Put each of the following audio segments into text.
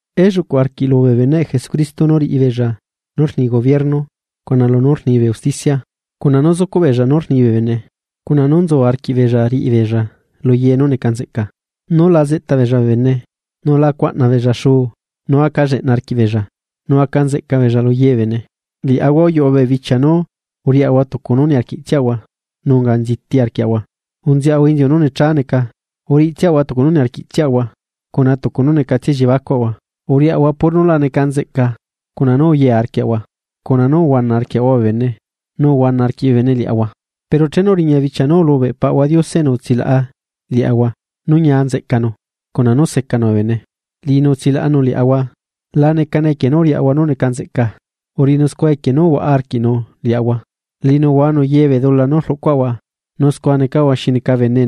Elluꞌculu arquiꞌ bee beneꞌ Jesucristo nú riꞌi beella nú rni gobierno cuna lunú rni bee usticia, cuna nú zucuꞌ beella nú rni bee bene, cuna nú nzu arquiꞌbeella riꞌi beella lu ye nú neca nzeꞌca. Nú la zeꞌta beella bee bene, nú la cuaꞌna beella xuu, nú aca lleꞌna arquiꞌbeella, nú aca nzeꞌca beella lu ye bee bene. Liaꞌahua uyuꞌu bee bichia nú uriaꞌahua tucu nú niarquiꞌtsiaꞌahua, nu unga nziti arquiaꞌahua, unzeꞌahua inziu nú necha neca, uriꞌitsiaꞌahua tucu nú niarquiꞌtsiaꞌahua cuna tucu nú necatsia elliebacuaꞌahua. Uriaꞌahua puro nú la neca nzeꞌca, cuna nú uye arquiaꞌahua cuna nú uhuana arquiaꞌahua bee bene nu uhuana arquiꞌ bee bene liaꞌahua. Pero chenu uriña bichia nú ulubeꞌ Paꞌahua Diose enu utsilaꞌa liaꞌahua nú ñia nzeꞌcanu, cuna nú secanu bee bene. Liꞌinu utsilaꞌanu liaꞌahua, la necane equie nú uriaꞌahua nú neca nzeꞌca, uriꞌinu scua equie nú uhuaꞌa arquiꞌnu liaꞌahua. Liꞌinu uhuanu ye bee dula nú rluꞌcuaꞌahua nu scua necaꞌahua xi neca bene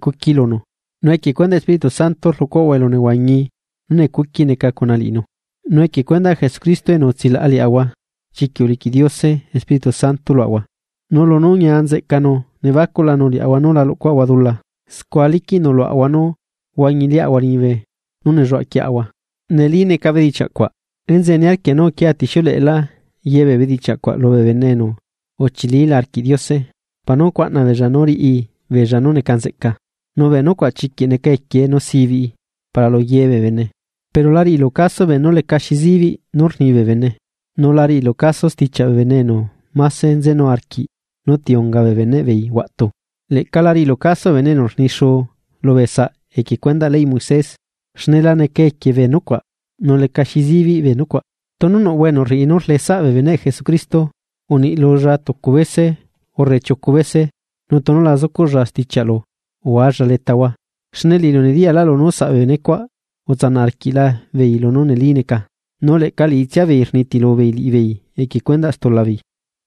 cuqui lunu, nu equie cuendaꞌ Espíritu Santo rluꞌcuaꞌahua elunehuañi nú necuqui neca cuna liꞌinu. Nu equie cuendaꞌ Jesucristo enu utsilaꞌa liaꞌahua, chiquiꞌ uliquiꞌ Diose Espirítu Santo luaꞌahua. Nu lunú ñia neca nzeꞌcanu nebacuꞌlanu liaꞌahua nú la luꞌcuaꞌahua dula, scua liquiꞌnu luaꞌahua nú huañi liꞌahua liñibe nú nelluaꞌa quieꞌahua. Neli neca bedichiaꞌ cuaꞌ. Enzeꞌe niarquia nú uquia tixiuleꞌelá ye bee bedichiaꞌ cuaꞌ lubee bene enu uchilila arquiꞌ Diose para nú cuaꞌna beella nú riꞌi beella nú neca nzeꞌca. Nu bee nucuaꞌ chiquiꞌ neca equiee nu sibiꞌi para lu ye bee bene. Pero la riꞌilu caso beenú lecaxi zibiꞌ rni bee bene, nu la riꞌilu caso stichiaꞌ bee bene enu máse nzenu arquiꞌ nú ti unga bee beneꞌ beei huaꞌtu. Leꞌca la riꞌilu caso bee bene enu rni xuu lubee saꞌ equie cuendaꞌ leyꞌ Moisés, xne la neca equie bee nucuaꞌ, nu lecaxi zibiꞌ bee nucuaꞌ. Tunu nuꞌhua enu rriꞌi nú rleꞌe saꞌ bee beneꞌ Jesucristo, uniꞌ lulla tucu bese urre chiucu bese nu tunu la zucuꞌlla stichiaꞌlu, uhualla letahua. Xne liꞌilu nediyaꞌlu nú saꞌ bee benecuaꞌ utsanaꞌ arquiꞌla beei lunú neli neca, nu leꞌca liꞌitsia beei rnitilu beei liꞌibeei equie cuendaꞌ stulabeei.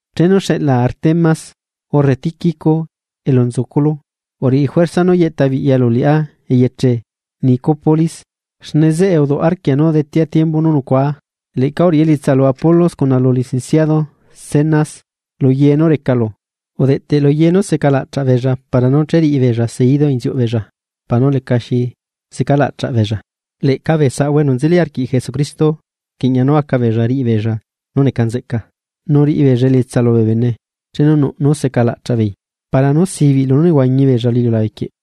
Chenu xeꞌlaa Artemas, urre Tíquico elu nzuculu, uriꞌi juerza nú yeꞌta biꞌyalu liꞌá eyeche Nicópolis, xne zeꞌe uduꞌ arquia nú detea tiembu nú nucuá. Leꞌca uriꞌi elietsa lu Apolos cuna lu licenciado Zenas lu ye nú recalu udeꞌteꞌ lu ye nú secalaꞌchaꞌ beella para nú cheriꞌibeella seidu inziuꞌ beella para nú lecaxi zecalaꞌchaꞌ beella. Leꞌca bee saꞌahua enu nzeli arquiꞌ Jesucristo rquiꞌña nú aca beella riꞌi beella nú neca nzeꞌca, nu riꞌi beella elietsa lubee bene chenu nuꞌ nú secalaꞌchaꞌ beei para nú sibiꞌ lunú nehuañi beella lu iliulabe quieꞌ.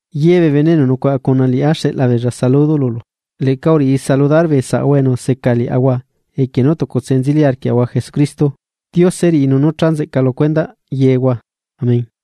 Ye bee bene enu nucuaꞌa cuna liꞌá xeꞌla beella saludo lulu. Leꞌca uriꞌi saludar bee saꞌahua enu seca liaꞌahua equie nú tucutse nzeli arquiaꞌahua Jesucristo. Diose riꞌi nú cha nzeꞌca lu cuendaꞌ yehua. Amén.